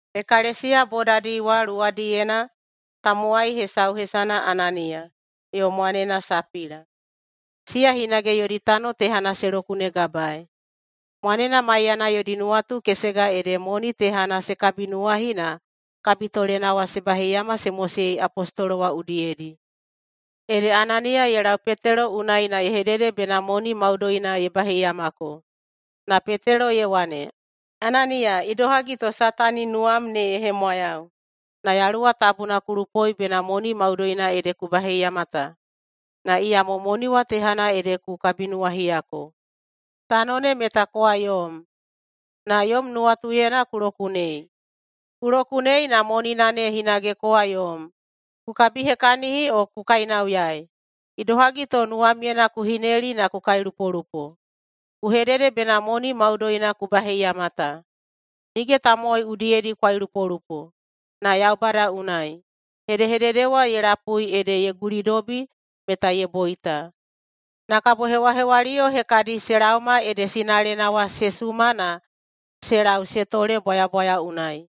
[Ekalesiya bodadi wa luwadiyena] tamowai hesau hesana Ananiya, yo mwanena Sapila. Siya hinage yodi tano tehana se lokunegabaei. Mwanena maiyana yodi nuwatu kesega ede monina tehana se kabinuwahi na kabitolena wa se baheiyama se mosei apostolo wa udiyedi. Ede Ananiya ye lau Petelo unai na ye hedede bena moni maudoina ye baheiyamako. Na Petelo ye wane, “Ananiya, idohagi to Satani nuwam ne ye hemwayau, na Yaluwa Tabuna ku lupoi bena moni maudoina ede ku baheiyama ta, na iyamo moni wa tehana ede ku kabinuwahiyako. Tano ne meta kowa yom, na yom nuwatuyena ku lokunei. Ku lokunei na monina ne hinage kowa yom, ku kabihekahini o ku kainauyaei. Idohagi to nuwamyena ku hineli na ku kailupolupo? Ku hedede bena moni maudoina ku baheiyama ta. Nige tamowai udiyedi ku kailupolupo, na Yaubada unai.” Hedehedede wa ye lapui ede ye gulidobi meta ye boita. Na kabo hewahewaliyo hekadi se laoma ede sinalena wa se suma na se lau se tole bwayabwaya unai.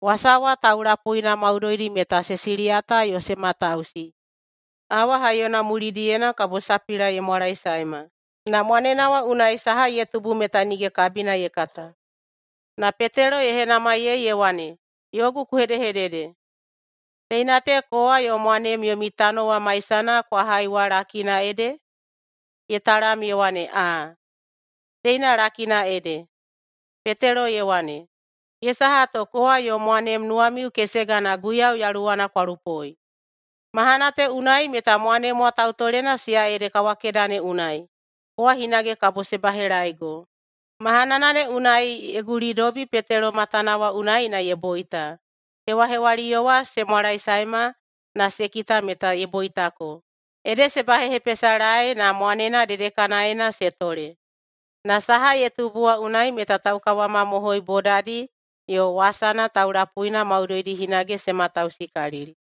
Wasa wa taulapuina maudoidi meta se siliyata yo se matausi. Awa haiyona mulidiyena kabo Sapila ye mwalaesaema, na mwanena wa unai saha ye tubu meta nige kabina ye kata. Na Petelo ye henamaiyei ye wane, “Yogu ku hedehedede, teina te kowa yo mwanem yomi tano wa maisana kwa hai wa lakina ede?” Ye talam ye wane, “Aa, teina lakina ede.” Petelo ye wane, “Ye saha to kowa yo mwanem nuwamiu kesega na Guiyau Yaluwana kwa lupoi? Mahana te unai meta mwanem wa tautolena siya ede kawakeda ne unai, kowa hinage kabo se bahelaeigo.” Mahanana ne unai ye gulidobi Petelo matana wa unai na ye boita. Hewahewaliyo wa se mwalaesaema na se kita meta ye boitako, ede se bahehepesalae na mwanena dedekanaena se tole. Na saha ye tubu wa unai meta taukawamamohoi bodadi yo wasana taulapuina maudoidi hinage se matausikalili.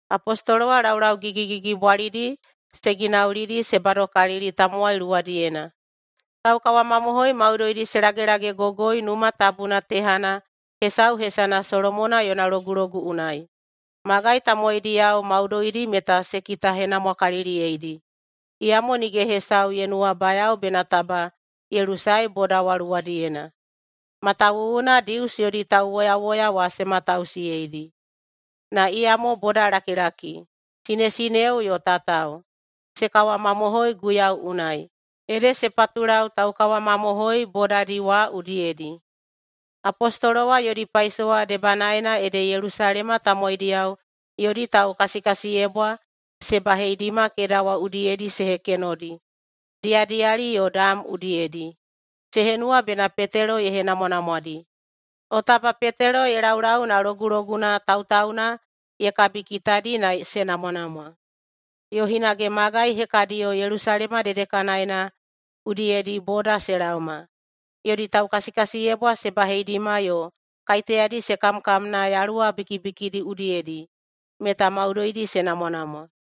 Apostolo wa laulau gigigigibwalidi se ginaulidi se badokalili tamowai luwadiyena. Taukawamamohoi maudoidi se lagelagegogoi Numa Tabuna tehana hesau hesana Solomona Yona Logulogu unai. Magai tamowaidiyao maudoidi meta se kitahenamwakaliliyeidi, iyamo nige hesau ye nuwabayao bena taba ye lusae boda wa luwadiyena, matawuwuna Dius yodi tauwoyawoya wa se matausiyeidi. Na iyamo bodalakilaki, sinesineo yo tatao, se kawamamohoi Guiyau unai, ede se patulau taukawamamohoi bodadi wa udiyedi. Apostolo wa yodi paisowa debanaena ede Yelusalema tamowaidiyao yodi taukasikasiyebwa se baheidima keda wa udiyedi se hekenodi diyadiyali yo dam udiyedi. Se henuwa bena Petelo ye henamwanamwadi, o taba Petelo ye laulau na loguloguna tautauna ye kabikitadi na se namwanamwa. Yo hinage magai hekadiyo Yelusalema dedekanaena udiyedi boda se laoma, yodi taukasikasiyebwa se baheidima yo kaiteyadi se kamkamna yaluwa bikibikidi udiyedi, meta maudoidi se namwanamwa.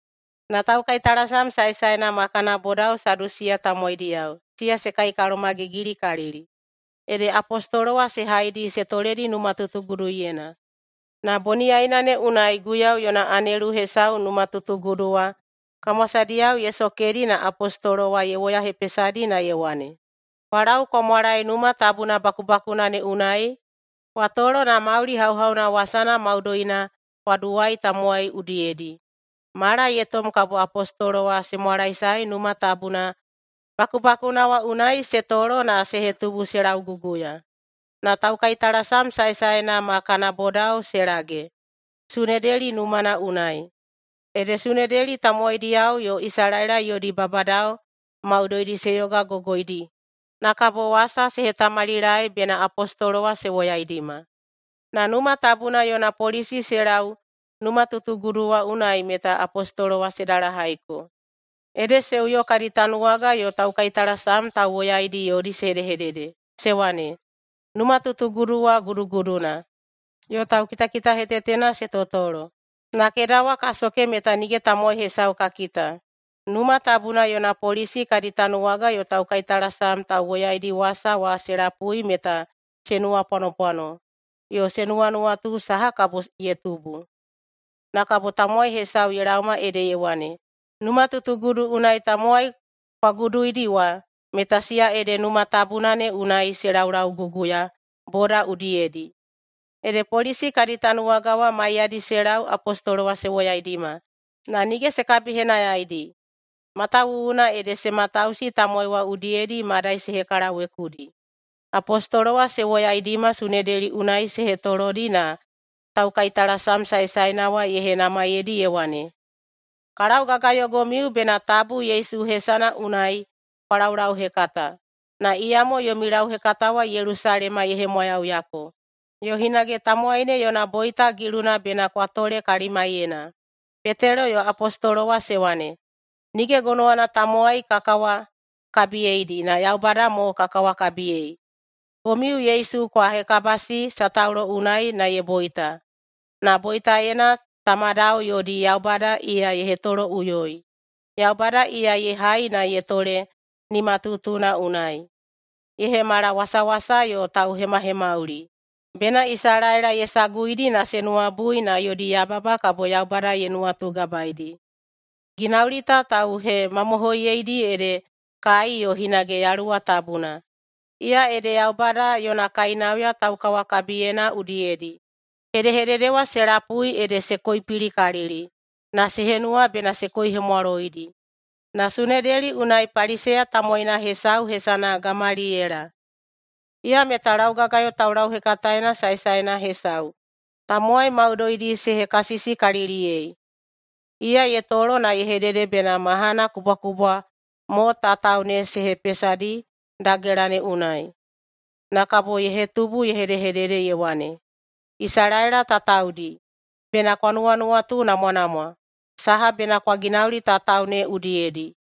Na taukaitalasam saesaena ma kana bodao Sadusiya tamowaidiyao, siya se kaikalomagigilikalili. Ede apostolo wa se haidi se toledi numatutuguduyena. Na boniyaina ne unai Guiyau yona anelu hesau numatutugudu wa kamwasadiyao ye sokedi na apostolo wa ye woyahepesadi na ye wane, “Kwa lau kwa mwalae Numa Tabuna bakubakuna ne unai kwa tolo na mauli hauhauna wasana maudoina kwa duwai tamowai udiyedi.” Mala ye tom kabo apostolo wa se mwalaesae Numa Tabuna bakubakuna wa unai se tolo na se hetubu se lauguguya. Na taukaitalasam saesaena ma kana bodao se lage Sunedeli numana unai. Ede Sunedeli tamowaidiyao yo Isalaela yodi babadao maudoidi se yogagogoidi. Na kabo wasa se hetamalilaei bena apostolo wa se woyaidima. Na Numa Tabuna yona polisi se lau numatutugudu wa unai meta apostolo wa se dalahaiko, ede se uyo kadi tanuwaga yo taukaitalasam tauwoyaidi yodi se hedehedede se wane, “Numatutugudu wa guduguduna, yo taukitakitahetetena se totolo, na keda wa ka soke meta nige tamowai hesau ka kita.” Numa Tabuna yona polisi kadi tanuwaga yo taukaitalasam tauwoyaidi wasa wa se lapui meta se nuwapwanopwano yo se nuwanuwatu saha kabo ye tubu. Na kabo tamowai hesau ye laoma ede ye wane, “Numatutugudu unai tamowai kwa guduidi wa, meta siya ede Numa Tabuna ne unai se laulauguguya boda udiyedi!” Ede polisi kadi tanuwaga wa maiyadi se lau apostolo wa se woyaidima, na nige se kabihenayaidi, matawuwuna ede se matausi tamowai wa udiyedi madai se hekalawekudi. Apostolo wa se woyaidima Sunedeli unai se hetolodi na taukaitalasam saesaena wa ye henamaiyeidi ye wane, “Ka laugagayoigomiu bena tabu Yesu hesana unai kwa laulauhekata, na iyamo yomi lauhekata wa Yelusalema ye hemwayauyako. Yo hinage tamowai ne yona boita giluna bena kwa tole kalimaiyena.” Petelo yo apostolo wa se wane, “Nige gonowana tamowai ka kawakabiyeidi, na Yaubada mo ka kawakabiyei. Komiu Yesu kwa hekabasi sataulo unai na ye boita, na boitaena tamadao yodi Yaubada iya ye hetoloꞌuyoi. Yaubada iya ye hai na ye tole nimatutuna unai. Ye hemala wasawasa yo tauhemahemauli, bena Isalaela ye saguidi na se nuwabui na yodi yababa kabo Yaubada ye nuwatugabaedi. Ginauli ta tauhemamohoiyedi ede kai yo hinage Yaluwa Tabuna. Iya ede Yaubada yona kainauya taukawakabiyena udiyedi.” Hedehedede wa se lapui ede se koipilikalili na se henuwa bena se koihemwaloidi. Na Sunedeli unai Paliseya tamowaina hesau hesana Gamaliyela, iya meta laugagayo taulauhekataena saesaena hesau tamowai maudoidi se hekasisikaliliyei. Iya ye tolo na ye hedede bena mahana kubwakubwa mo tatao ne se hepesadi dagela ne unai. Na kabo ye hetubu ye hedehedede, ye wane, “Isalaela tataodi, bena kwa nuwanuwatunamwanamwa saha bena kwa ginauli tatao ne udiyedi.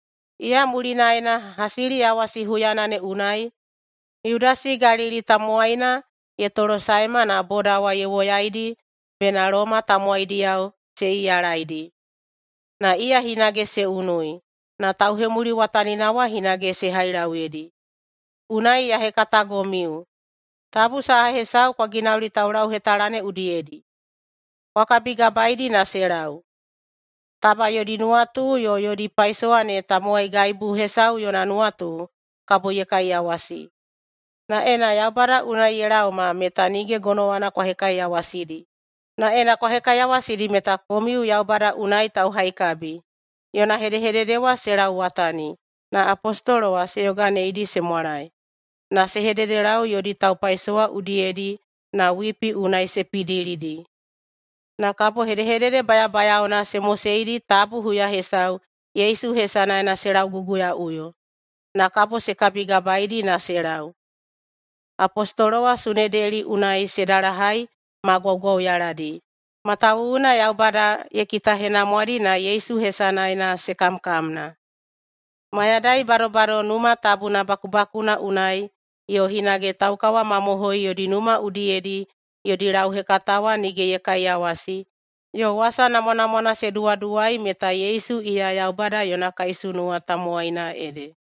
Iya mulinaena, hasiliyawasi huyana ne unai, Yudasi Galili tamowaina ye tolosaema na boda ye woyaidi bena Loma tamowaidiyao se iyalaidi. Na iya hinage se unui, na tauhemuliwatanina wa hinage se hailauyedi. Unai ya hekatagomiu: Tabu saha hesau kwa ginauli taulauhetala ne udiyedi. Kwa kabigabaeidi na se lau. Taba yodi nuwatu yo yodi paisowa ne tamowaigaibu hesau yona nuwatu, kabo ye kaiyawasi. Na ena Yaubada unai ye laoma, meta nige gonowana kwa hekaiyawasidi, na ena kwa hekaiyawasidi meta komiu Yaubada unai tauhaikabi.” Yona hedehedede wa se lauwatani na apostolo wa se yoganeidi se mwalae. Na se hededelau yodi taupaisowa udiyedi na wipi unai se pidilidi. Na kabo hedehedede bayabayaona se moseidi tabu huya hesau Yesu hesanaena se lauguguyaꞌuyo. Na kabo se kabigabaedi na se lau. Apostolo wa Sunedeli unai se dalahai ma gwaugwauyaladi, matawuwuna Yaubada ye kitahenamwadi na Yesu hesanaena se kamkamna. Mayadai badobado Numa Tabuna bakubakuna unai yo hinage taukawamamohoi yodi numa udiyedi yodi lauhekata wa nige ye kaiyawasi yo wasa namwanamwana se duwaduwai meta Yesu iya Yaubada yona kaisunuwa tamowaina ede.